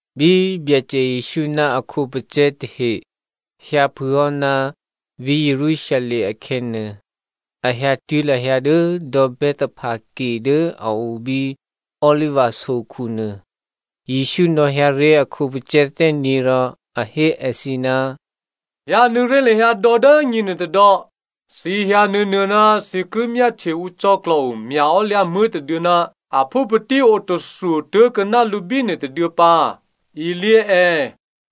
Bí Byacè Jesǔ ná a khǒpacè̤̌ tahe hyǎphûhò́ ná vǐ̤ Jerusalem akhè̌nuô, a hyǎtuố̤ lahyǎ dố dò̌ Bethphage dố a o bí Oliva sokhu nuô. Jesǔ nò̌hyǎ ré̤ a khǒpacè̤̌ thè́nyě̤ rò a hé èthǐ, “Hyǎnuô̌ ré̤ lahyǎ dò̌ dố nyěnuô tôdò̌, thǐ hyǎ nuô̌nuô̌ ná thǐ ki myáhtye ǔ cò̌klò̤o mya̤ò́lyǎmuố̤ tôduô̌ ná aphúpatí otathwo tố̤kuô̌ná lǔ bínuô tôduô̌ pǎ. Ilyě è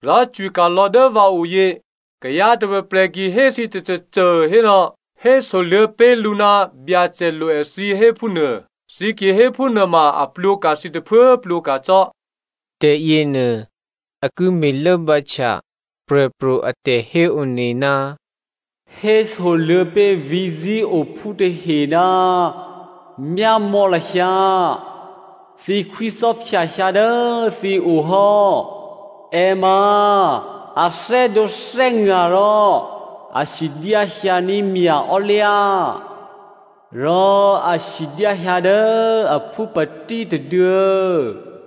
rò cwika̤lò̌ dố vǎoyě. Kayǎ tôprè̤prè̤ ki hé thǐ tôcôcô hérò, hésoluô̌ pé̤ lǔ ná Byacè lo èthǐ héphúnuô, thǐ ki hé phúnuôma a plwǒka̤ thǐ tôphuố plwǒka̤ cò́.” Tè̤yěnuô a ki me̤lốbǎhtya prè̤pro̤ a tè̤héone, “Hésoluô̌ pé̤ vǐ̤ Zionphú tahe, ‘Myámò̌ lahyǎ, thǐ khwícò́phya hyǎ dố thǐ o hò́. È ma a thè́dǒthè́nga̤ rò a sidyá hyǎní̤ mya̤ò́lyǎ. Rò a sidyá hyǎ dố aphúpatí tôduô̌.’”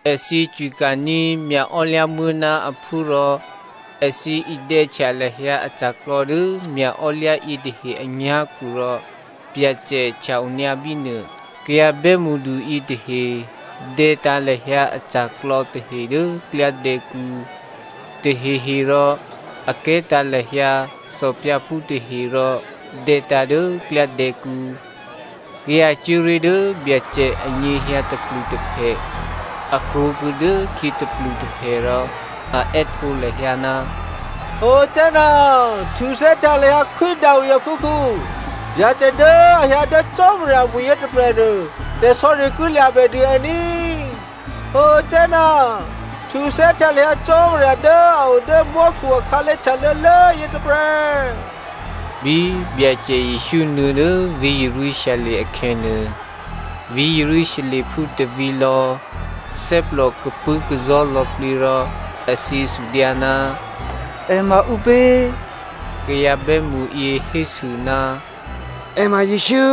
Èthǐ cwika̤ní̤ mya̤ò́lyǎmuố̤ ná aphú rò èthǐ idè̌htya lahyǎ aca̤klò̌ dố mya̤ò́lyǎ yětahe anyá̤khu rò Byacè htya-onyǎ bínuô. Kayǎ bè́mṳdu yětahe dè̌tǎ̤ lahyǎ aca̤klò̌ tahe dố klyádè̌kǔ. Taheherò a kè̤́tǎ̤ lahyǎ thòphyǎphú tahe rò dè̌tǎ̤ dố klyádè̌kǔ. Kayǎ cuố ré̤ dố Byacè anyěhyǎ tôplutôphè, a krwǒkuô̌ dốkhyě tôplutôphè rò a è́htǒ lahyǎ, “Hosanna, htuthè́htya lahyǎ Khwí Davi aphúkhǔ.” “Byacè dố a hyǎ dố Cò́marya amwi̤yě tôprè̤nuô, tè̤sò̌ri ki lya̤bèdû è ní꤮” “Hosanna, htuthè́htya lahyǎ Cò́marya dố a o dố mò́khu akhǎlé̤ htyalô̌lố yětôprè̤.” Bí Byacè Jesǔ nuô̌ dố vǐ̤ Jerusalem akhè̌nuô, vǐ̤ Jerusalemphú tôvǐ̤lò̌ thè́plò tapṳ̂́kazò̤́ lò̌plǐ rò èthǐ sudyǎ, “È ma ǔpě?” Kayǎ bè́mṳyě hésû, “È ma Jesǔ.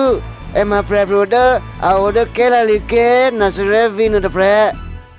È ma prè̤pro̤ dố a o dố Galilea ké̤, Nazarè vǐ̤nuô tôprè̤.”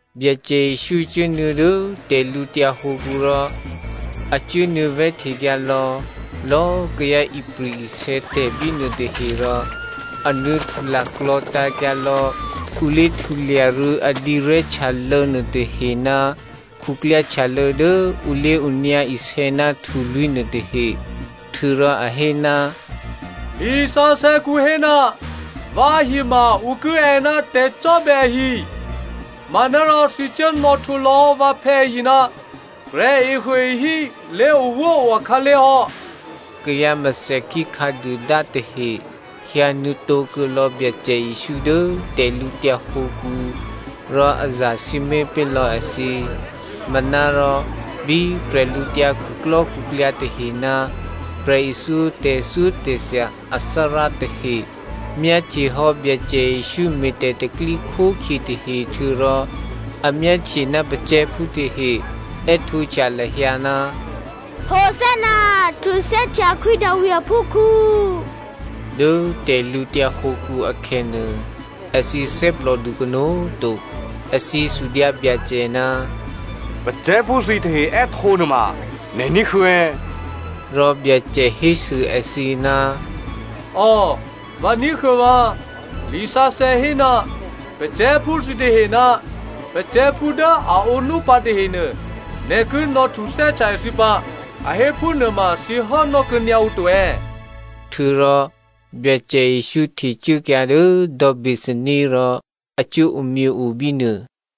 Byacè Jesǔ cuốnuô̌ dố tè̤lǔtyǎ hǒkǔ rò a cuốnuô̌ vè̤́htekyǎ lò̌lò̌꤮ kayǎ ipri̤-isè̌tè̤ bínuô tahe rò a nuô̌htu laklò̤̌tǎ̤kyǎ lò̌ ǔ lé̤htulya rû̌ a dǐrè̤́htyalô̌ nuôtahe ná khuklyáhtyalô̌ dố ǔ lé̤onyǎ isè̌ ná htulwí̤ nuôtahe. Htuô̌rò a hé, “Lisǎsè̌kǔ hé, ‘Vǎhi ma ǔ ki è́ ná tè̤cò́bè̌ ahi,’ manárò thǐ cuố nò̌htwǒ lò̌hò́ vǎphè̌ ahi ná ‘Prè̤ehuôehí lé̤owóo akhǎlé̤ hò́.’” Kayǎ mèthèkhí khǎduôdá tahe hyǎnuô̌tǒ kuô̌lò̌ Byacè Jesǔ dố tè̤lǔtyǎ hǒkǔ, rò a zasǐmé̤ pé̤lò̌ èthǐ. Manárò bí bwídukhu tahe ná prè̤ithyó tè̤thyótè̤thya athárá tahe myáhtyehò́ Byacè Jesǔ me̤ tè̤pro̤tè̤prya̤ tahe htuô̌rò a myáhtye ná pacè̤̌phú tahe è́htǒhtya lahyǎ, “Hosanna, htuthè́htya Khwí Davi aphúkhǔ,” dố tè̤lǔtyǎ hǒkǔ akhè̌nuô, èthǐ thè́plòdu kanó̤꤮ to. Èthǐ sudyǎ Byacè, “Pacè̤̌phú thǐtahe è́htǒ nuôma nè̤ ní̤huô̌ è̌?” Rò Byacè hésû èthǐ, “Ò, vǎ ní̤huô̌ vǎ꤮, lisǎsè̌ hé, ‘Pacè̤̌phú thǐtahe ná pacè̤̌phú dố a ǒnúpǎ tahenuô, nè̤ ki nò̌htuthè́htya èthǐ pǎ,’ a hé phúnuô ma thǐ hốnò́ kuô̌nyǎ ǔ to è̌?” Htuô̌rò Byacè Jesǔ htecuốkyǎ dố dò̌ Bethania rò a cuố omyěo bínuô.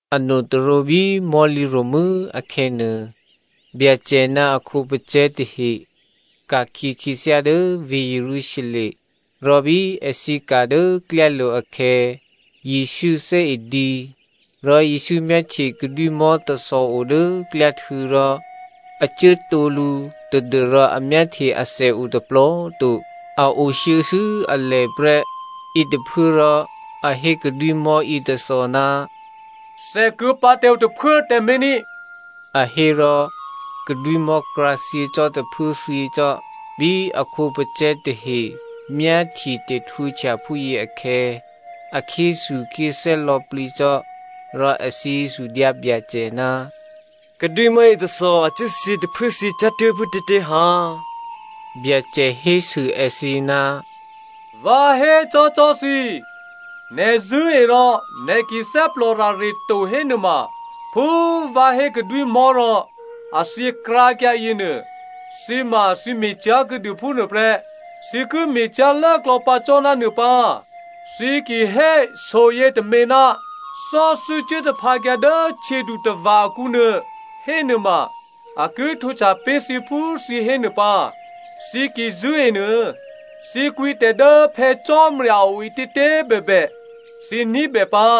Anotôrǒ bí mò̤́lǐ ro̤mû́ akhè̌nuô, Byacè ná a khǒpacè̤̌ tahe ka̤khyě khyěthyá dố vǐ̤ Jerusalem, rò bí èthǐ ka̤ dố klyálo̤ akhè̌, Jesǔ thè́e dǐ. Rò Jesǔ myáhtye kadwímò̤́ tôthò o dố klyáhtû̌ rò a cuố tǒ lǔ tadû́rò a myáhtye athè o tôplò꤮ to. A o shuô̌shuô̌ alè prè́. Yětôphuốrò a hé kadwímò̤́ yětôthò, “Thèkuô̌ pǎ tǎ ǔ tôphuố꤮ tǎmé̤ ní꤮” a hé rò kadwímò̤́ krǎthyě cò́ tôphuốthyě cò́. Bí a khǒpacè̤̌ tahe myáhtye tè̤htwǒhtya phúyě akhè̌, a khyéthukhyéthè́ lò̌plǐ cò́. Rò èthǐ sudyǎ Byacè, “Kadwímò̤́ yětôthò a cuốthyě tôphuốthyě cyá̤tuố̤ phútětě ha?” Byacè hésû èthǐ, “Vǎ hécò́cò́ thǐ꤮, nè̤ zṳ̂́e rò nè̤ ki thè́plòrare to hénuôma phú vǎ hé kadwímò̤́ rò a thyěkrǎkyǎ yěnuô, thǐ ma꤮ thǐ me̤ cyá̤kuô̌dû phúnuô prè́. Thǐ ki me̤cyá̤lốklò̌ pǎ cò́ ná nuô pǎ. Thǐ ki hé so yětômě, ‘Thò́thû́ cuố taphǎkyǎ dố htyědutava̤ akǔnuô,’ hénuôma a ki htwǒhtya pé̤ thǐ phú thǐ hé nuô pǎ. Thǐ ki zṳ̂́e nuô, thǐ kwǐtè̤ dố Phè̌ Cò́marya a o ǐtětě꤮ bèbè thǐ ní̤bè pǎ.”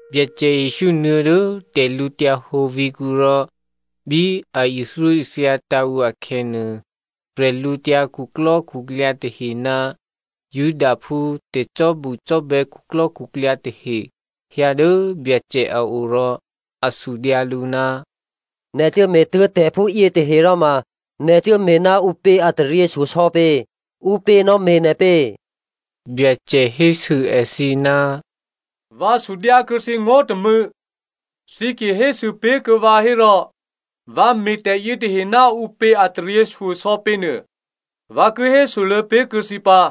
Byacè Jesǔ nuô̌ dố tè̤lǔhǒdu vǐ̤kǔ rò bí a ithyóithyatǎ̤ ǔ akhè̌nuô, bwídukhu tahe ná Judaphú tè̤cò́bucò́bè̌ khuklò́khuklyǎ tahe hyǎ dố Byacè a o rò a sudyǎ lǔ, “Nè̤ cuốme̤tuố̤ tè̤phúyě tahe ròma nè̤ cuốme̤ ná ǔpě a taryěshyosò̌ pě? Ǔpě nò̌me̤ nè̤ pě?” Byacè hésû èthǐ, “Vǎ sudyǎ kuô̌ thǐ ngó̤ tômû̌, thǐ ki hésû pé̤ kuô̌ vǎ hérò vǎ me̤ tè̤yětahe ná ǔpě a taryěshyosò̌ pěnuô vǎ ki hésoluô̌ pé̤kuô̌ thǐ pǎ.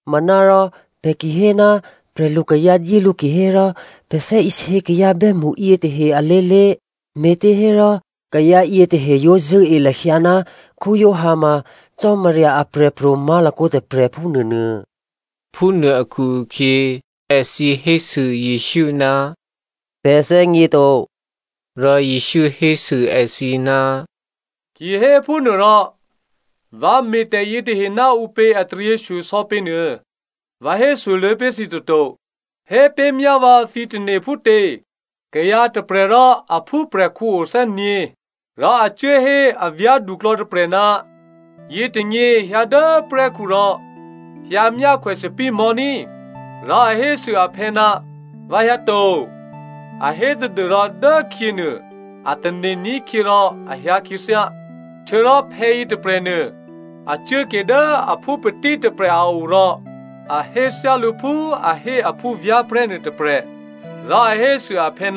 Manárò pè̤ ki hé, ‘Prè̤lukayǎ dyé lǔ’ kihérò, pè̤ thè́isě kayǎ bè́mṳ yětahe alé̤lé̤, me̤těhérò kayǎ yětahe yǒ zṳ̂́e lahyǎ ná Giovanni ma Cò́marya aprè̤pro̤ má̤lakǒ tôprè̤, phúnuônuô.” Phúnuô akhu-akhyě èthǐ hésû Jesǔ, “Pè̤ thè́gněto.” Rò Jesǔ hésû èthǐ, “Kihéphúnuôrò vǎ me̤tè̤ yětahe ná ǔpě a taryěshyosò̌ pě nuô vǎ hésoluô̌ pé̤ thǐ toto.” “Hé pé̤myá vǎ thǐ tane̤ phútě? Kayǎ tôprè̤ rò a phúprè̤khǔ o thè́nyě̤. Rò a cuố hé a vyá̤duklò̌ tôprè̤, ‘Yětônyě hyǎ dố prè́khu rò hyǎmyákhwè thòbǐthèmò̤́ ní꤮.’ “Rò a hésû aphè̌, ‘Vǎ hyǎ to,’ a hé tadû́rò dốkhyě nuô a tane̤ ní̤khyě rò a hyǎ khyěthyá. “Htuô̌rò phè̌yě tôprè̤nuô a cuốke dố aphúpatí tôprè̤ a o rò a hé thyálǔ phú a hé a phúvyá̤prè̤́ nuôtôprè̤. Rò a hésû aphè̌,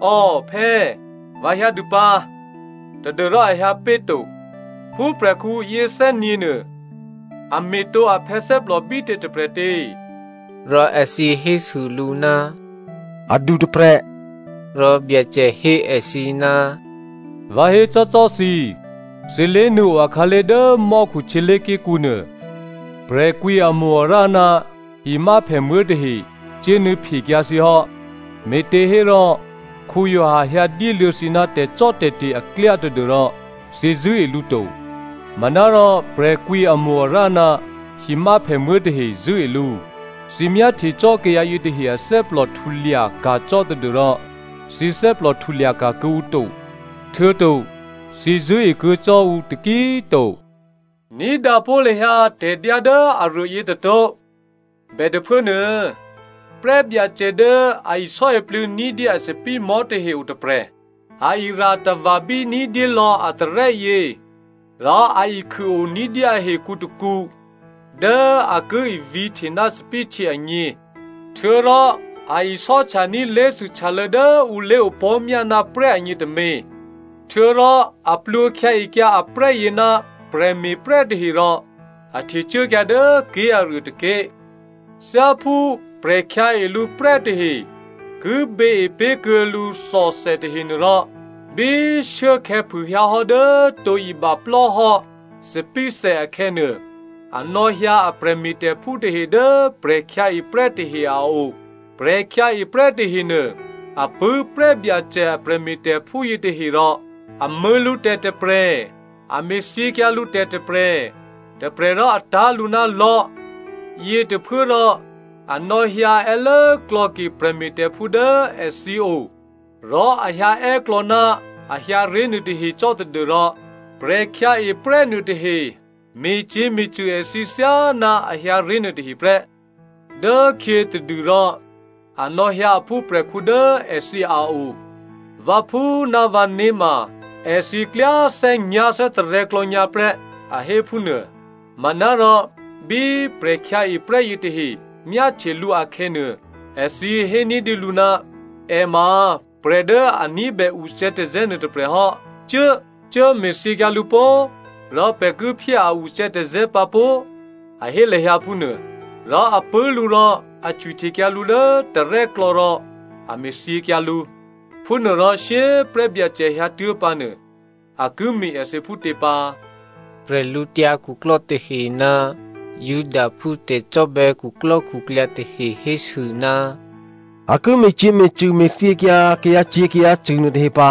‘Ò phè̌, vǎ hyǎdû pǎ,’ tadû́rò a hyǎ péto. “Phúprè̤khǔ yěthè́nyě̤nuô, a me̤tǒ aphè̌ thè́plò bítě tôprè̤tě?” Rò èthǐ hésû lǔ, “Adu tôprè̤.” Rò Byacè hé èthǐ, “Vǎ hécò́cò́ thǐ, thǐ lé̤nuô̌o akhǎlé̤ dố mò́khu htyělé̤ké̤kǔ nuô, prè̤kwǐamo-arǎ ná himyáphèmuố̤ tahe cuốnuô̌phekyǎ thǐ hò́. Me̤těhérò Giovanni hyǎ dyéluô̌ thǐ ná tè̤cò́tè̤te̤ aklyá tadû́rò thǐ zṳ̂́e lǔ to. Manárò prè̤kwǐamo-arǎ ná himyáphèmuố̤ tahe zṳ̂́e lǔ. Thǐ myáhtye cò́ kayǎ yětahe athè́plò htulya ka̤ cò́ tadû́rò thǐ thè́plò htulyaka̤ kuô̌ǔ to htuô̌to thǐ zṳ̂́ekuô̌ cò́ ǔ taki꤮ to. “Ní̤dǎ pó̤ lahyǎ tè̤dyá dố aruô yětôtó̤. Bètôphuốnuô prè́byacè dố a isò́iplû̌ ní̤dyé a thòbǐthèmò̤́ tahe otôprè̤. A ira̤tava̤bí ní̤dyé lò̌ a tarè́yě, rò a ikhûo ní̤dyé ahekǔ tôkǔ dố a ki ivǐ̤hte ná thòbǐthèhtyě agně, htuô̌rò a isò́htya ní̤ lé̤thûhtyalô̌ dố ǔ lé̤opò̤́myá ná prè́ agně tômě. Htuô̌rò a plwǒkhyǎekyǎ aprè́yě ná prè̤me̤prè́ tahe rò a htecuốkyǎ dố ké̤aruô tôké̤. Thyáphú prè̤khyǎe lǔ prè́ tahe ki běepé̤ kuô̌ lǔ thòthè tahenuôrò, bí shuốkhè̌ phûhyǎ hò́ dố tǒ ibaplò́ hò́ thòbǐthè akhè̌ nuô, a nò̌hyǎ a prè̤me̤tè̤phú tahe dố prè̤khyǎeprè́ tahe a o. “Prè̤khyǎeprè́ tahenuô a pṳ̂́ prè́byacè a prè̤me̤tè̤phú yětahe rò a mṳ̂̌ lǔtè̤ tôprè̤, a me̤thyěkyǎ lǔtè̤ tôprè̤, tôprè̤ rò a tá̤ lǔ ná lò̤́. Yětôphuốrò a nò̌hyǎ è́lốklò̌ke prè̤me̤tè̤phú dố èthǐ o rò a hyǎè́ klò̌ ná a hyǎ ré̤ nuôtahe cò́ tadû́rò prè̤khyǎeprè́ nuôtahe me̤cyě̤me̤cṳ̂ èthǐ thyáná a hyǎ ré̤ nuôtahe prè́. Dốkhyětadûrò, a nò̌hyǎ a phúprè̤khǔ dố èthǐ a o. ‘Vǎphú ná vǎné̤ ma èthǐ klyá thè́nyá̤thè́tarè̤̌ klò̌nyǎ prè́,’ a hé phúnuô. “Manárò bí prè̤khyǎeprè́ yětahe myáhtye lǔ akhè̌nuô, èthǐ hé ní̤dyélǔ, ‘È ma prè̤ dố a ní̤bè ucè̌tazè̌ nuôtôprè̤ hò́, cuố! Cuốme̤thyěkyǎ lǔ pó꤮, rò pè̤ ki phyé a ucè̌tazè̌ pǎ pó꤮,’ a hé lahyǎ phúnuô. Rò a pṳ̂́ lǔ rò a cwihtekyǎ lǔ dố tarè́klò̌ rò a me̤thyěkyǎ lǔ. “Phúnuôrò shyé꤮ prè́byacè hyǎtuố̤ pǎnuô, a ki me̤ èthǐ phútě pǎ?” Prè̤lǔtyǎ khuklò́ tahe ná Judaphú tè̤cò́bè̌ khuklò́khuklyǎ tahe hésû, “A ki me̤cyě̤me̤cṳ̂, me̤thyěkyǎ kayǎcyě̤kayǎcṳ̂ nuôtahe pǎ.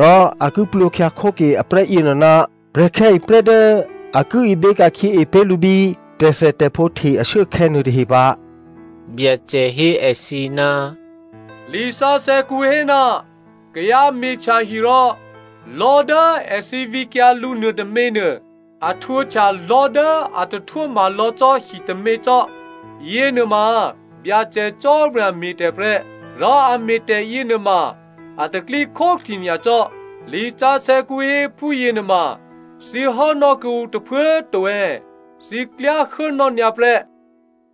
Rò a ki plwǒkhyǎ khóke aprè́ yěnuô ná prè̤khyǎeprè́ dố a ki ibě ka̤khyěe pé̤ lǔ bí tè̤thètè̤phǒ hte ashuốakhè̌ nuôtahe pǎ.” Byacè hé èthǐ, “Lisǎsè̌kǔ hé, ‘Kayǎ me̤htya hi rò lò̤́ dố èthǐ vǐkyǎ lǔ nuôtôměnuô a htwǒhtya lò̤́ dố a tahtwóma lò̌ cò́ hitômě cò́. Yěnuôma Byacè Cò́marya me̤tè̤ prè́, rò a me̤tè̤ yěnuôma a tè̤pro̤tè̤prya̤ nyacò́.’ “Lisǎsè̌kǔ hé phúyěnuôma thǐ hốnò́ kuô̌ǔ tôphuố꤮ to è̌? Thǐ klyá hốnò́ nyǎprè́.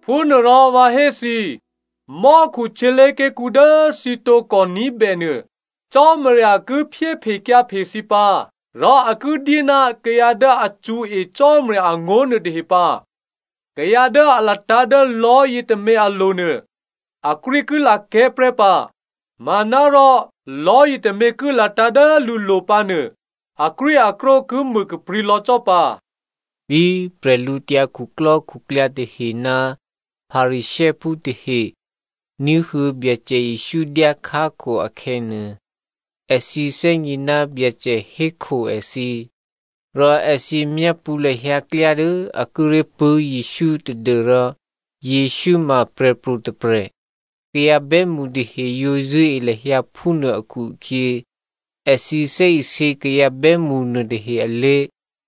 “Phúnuôrò vǎ hé thǐ mò́khu htyělé̤ké̤kǔ dố thǐ tǒkò ní̤bènuô Cò́marya ki phyéphekyǎphe thǐ pǎ. Rò a ki dyé ná kayǎ dố a cṳ̌e Cò́marya angó̤ nuôtahe pǎ. Kayǎ dố a latǎ̤ dố lò̤́ yětômě alo̤nuô, akrwí ki lakè̤́ prè́ pǎ, manárò lò̤́ yětômě ki latǎ̤ dố lǔlo̤ pǎ nuô, akrwíakrwó ki mû kaprǐ̤ lò̌ cò́ pǎ.” Bí bwídukhu tahe ná Pharisěophú tahe ní̤huô̌ Byacè Jesǔ dyákhákho akhè̌nuô, èthǐ thè́gně ná Byacè hékho èthǐ. Rò èthǐ myápṳ̌ lahyǎ klyá dố a kíré̤ pṳ̂́ Jesǔ tadû́rò Jesǔ ma prè̤pro̤ tôprè̤, kayǎ bè́mṳ tahe yǒ zṳ̂́e lahyǎ phúnuô akhu-akhyě, èthǐ thè́isě kayǎ bè́mṳ nuôtahe alé̤.